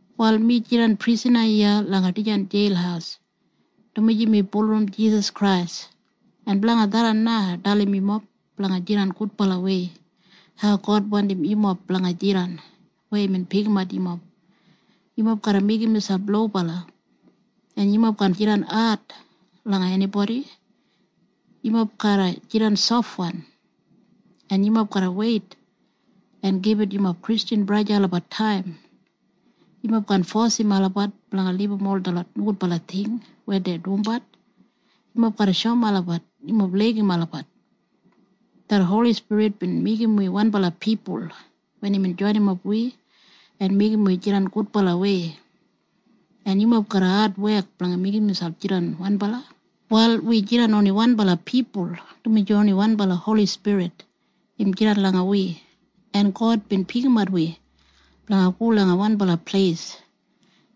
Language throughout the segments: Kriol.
Wal mi jidan prisana iya langa dijan jeil dumaji mi bulurrum Jisas Krais. En blanga tharran na ai dalim yumob blanga jidan gudbalawei hau God wandim yumob blanga jidan weya imbin pikimat yumob. Yumob garra meigim miselp lobala, en yumob kaan jidan ad langa enibodi. Yumob garra jidan sofwan, en yumob garra weit en gibit yumob Kristjan braja en sista olabat taim. Yumob kaan fosim olabat blanga libum ol detlot nogudbala ting weya dei dumbat. Yumob garra shoum olabat yumob laigim olabat. Det Holi Spirit bin meigim wi wanbala pipul wen imbin joinimap wi en meigim wi jidan gudbalawei, en yumob garra adwek blanga meigim miselp jidan wanbala. Wal wi ol jidan wanbala pipul, dumaji oni wanbala Holi Spirit im jidan langa wi, en God bin pikimat wi blanga go langa wanbala pleis,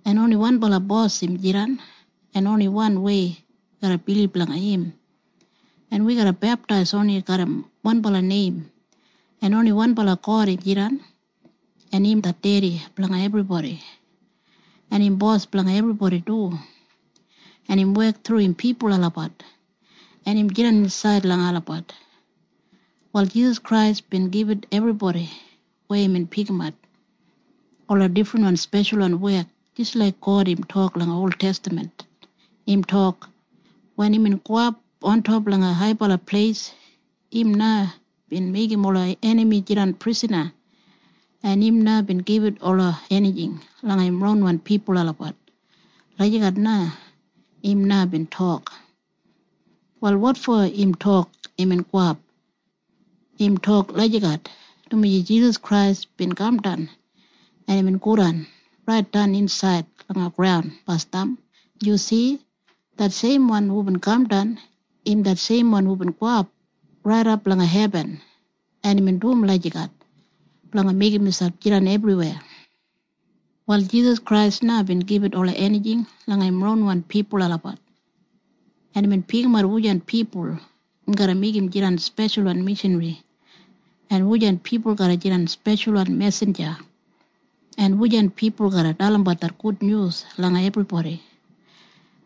en oni wanbala Bos im jidan, en oni wanwei wi garra bilib langa im, en wi garra beptais oni garram wanbala neim, en oni wanbala God im jidan, en im det Dedi blanga ebribodi, en im Bos blanga ebribodi du, en im wek thru im pipul olabat, en im jidan insaid langa olabat. Wal Jisas Krais bin gibit ebribodi weya imbin pikimat ola difrinwan speshalwan wek jis laik God im tok langa oltestaman. Im tok, “Wen imbin gowap ontop langa haibala pleis, im na bin meigim ola enami jidan prisana, en im na bin gibit ola enijing langa im ronwan pipul olabat.” Lagijat na imbin tok. Wal wotfo im tok, “Imbin gowap”? Im tok lagijat dumaji Jisas Krais bin kamdan, en imbin godan raitdan insaid langa graun basdam. Yu si? Det seimwan hubin kamdan, im det seimwan hubin gowap raidap langa hebin. En imbin dum lagijat blanga meigim miselp jidan ebriweya. Wal Jisas Krais na bin gibit pawa langa im ronwan pipul olabat blanga dum im wek. Im pikimat wujan pipul im garra meigim jidan speshalwan mishanri, en wujan pipul garra jidan speshalwan mesinja, en wujan pipul garra dalimbat det Gudnyus langa ebribodi,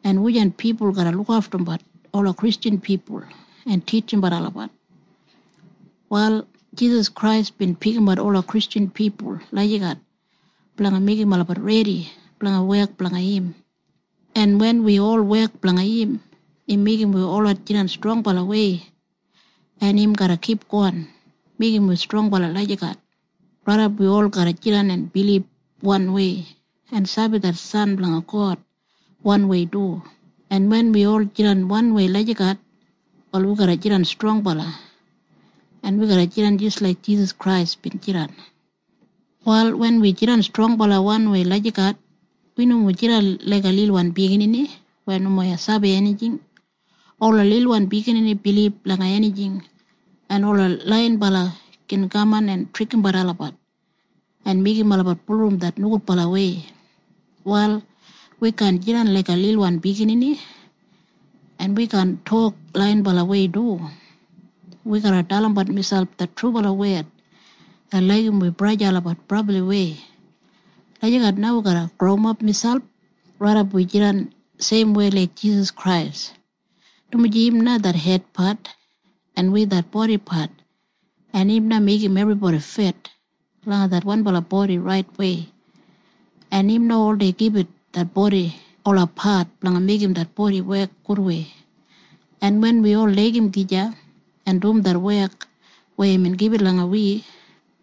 en wujan pipul garra lukaftumbat ola Kristjan pipul en titjimbat olabat. Wal Jisas Krais bin pikimat ola Kristjan pipul lagijat blanga meigim olabat redi blanga wek blanga im, en wen wi ol wek blanga im, im meigim wi holot jidan strongbalawei, en im garra kipgon meigim wi strongbala lagijat raidap wi ol garra bilib wanwei en sabi det San blanga God trubalawei du. En wen wi ol jidan wanwei lagijat, wal wi garra jidan strongbala en wi garra jidan jis laik Jisas Krais bin jidan. Wal wen wi jidan strongbala wanwei lagijat, wi nomo jidan laiga lilwan biginini weya nomo sabi enijing. Ola lilwan biginini bilib langa enijing, en ola laiyinbala gin kaman en trikimbat olabat en meigim olabat bulurrum det nogudbalawei. Wal wi kaan jidan laiga lilwan biginini, en wi kaan tok laiyinbalawei du. Wi garra dalimbat miselp det trubala wed en laigim wi braja en sista olabat brabliwei. Lagijat na wi garra growimap miselp raidap wi jidan seimwei laik Jisas Krais, dumaji im na det hedpat en wi det bodipat, en im na meigim ebribodi fit langa det wanbala bodi raitwei, en im na oldei gibit det bodi ola pat blanga meigim det bodi wek gudwei. En wen wi ol laigim gija en dum det wek weya imbin gibit langa wi,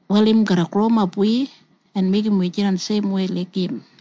wal im growimap wi en meigim wi jidan seimwei laik im.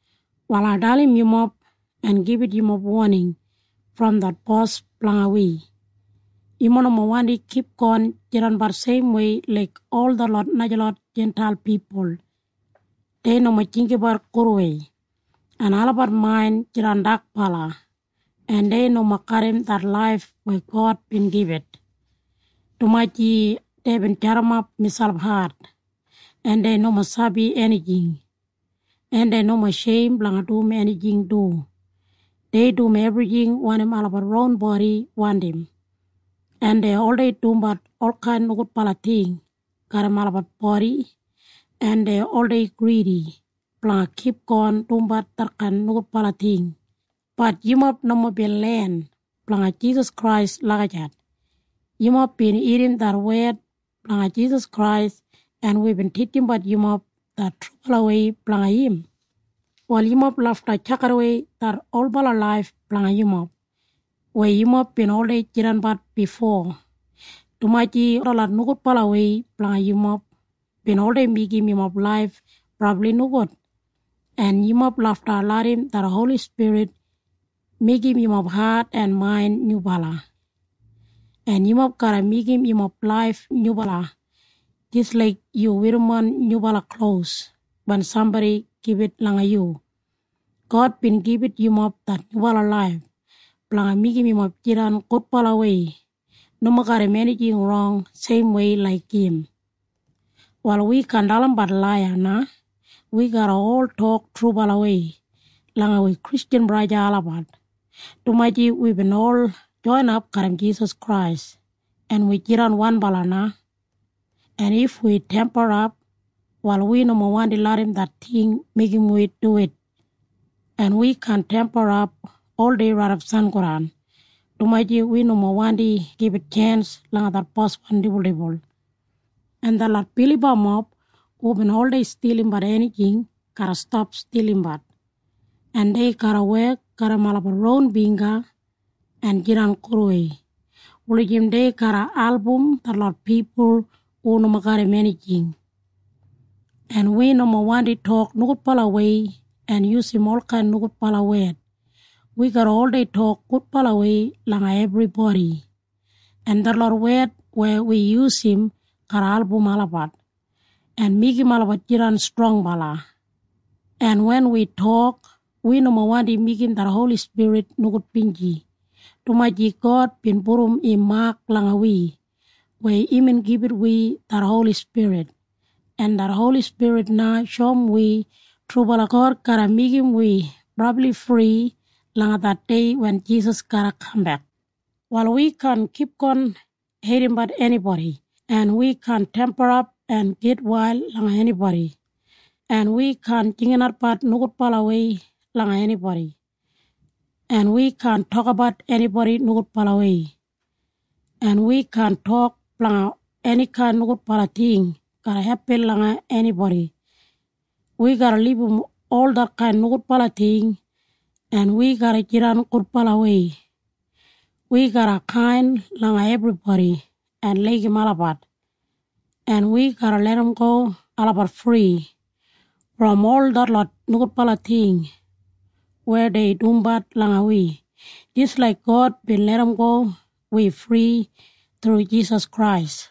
Wal ai dalim yumob en gibit yumob woning brom det Bos blanga wi. Yumob nomo wandi kipgon jidanbat seimwei laik ol detlot najalot Jintail pipul. Dei nomo jinggabat gudwei, en olabat main jidan dakbala, en dei nomo garram det laif weya God bin gibit, dumaji deibin jadimap miselp hat, en dei nomo sabi enijing, en dei nomo sheim blanga dum enijing du. Dei dum ebrijing wanim olabat ron bodi wandim, en dei oldei dumbat olkain nogudbala ting garram olabat bodi, en dei oldei gridi blanga kipgon dumbat detkain nogudbala ting. Bat yumob nomo bin len blanga Jisas Krais lagijat. Yumob bin irrim det wed blanga Jisas Krais, en wibin titjimbat yumob det trubalawei blanga im. Wal yumob lafta tjakidawei det olbala laif blanga yumob weya yumob bin oldei jidanbat bifo, dumaji detlot nogudbalawei blanga yumob bin oldei meigim yumob laif brabli nogud. En yumob lafta larram det Holi Spirit meigim yumob hat en main nyubala, en yumob garra meigim yumob laif nyubala jis laik yu werrimon nyubala klos wen sambodi gibit langa yu. God bin gibit yumob det nyubala laif blanga meigim yumob jidan gudbalawei, nomo garram enijing rong seimwei laik im. Wal wi kaan dalimbat laiya na. Wi garra ol tok trubalawei langa wi Kristjan braja en sista olabat, dumaji wibin ol joinap garram Jisas Krais en wi jidan wanbala na. En if wi temperap, wal wi nomo wandi larram det ting meigim wi duwit, en wi kaan temperap oldei raidap sangodan, dumaji wi nomo wandi gibit tjens langa det boswan dibuldibul. En detlot bilibamob hubin oldei stilimbat enijing garra stap stilimbat, en dei garra wek en jidan gudwei wulijim dei garra album najalot pipul hu nomo garram enijing. En wi nomo wandi tok nogudbalawei en yusum olkain nogudbala wed. Wi garra oldei tok gudbalawei langa ebribodi, en detlot wed weya wi yusum garra album olabat en meigim olabat jidan strongbala, en wen wi tok, wi nomo wandi meigim det Holi Spirit nogudbinji, dumaji God bin pudum im mak langa wi wen imbin gibit wi det Holi Spirit, en det Holi Spirit na shoum wi trubala God garra meigim wi brabli fri langa det dei wen Jisas garra kambek. Wal wi kaan kipgon heidimbat enibodi, en wi kaan temperap en gitwail langa enibodi, en wi kaan jinginatbat nogudbalawei langa enibodi, en wi kaan tokabat enibodi nogudbalawei, en wi kaan tok blanga enikain nogudbala ting garra hepin langa enibodi. Wi garra libum ol detkain nogudbala ting, en wi garra jidan gudbalawei. Wi garra kain langa ebribodi en laigim olabat, en wi garra larramgo olabat fri brom ol detlot nogudbala ting weya dei dumbat langa wi jis laik God bin larramgo wi fri thru Jisas Krais.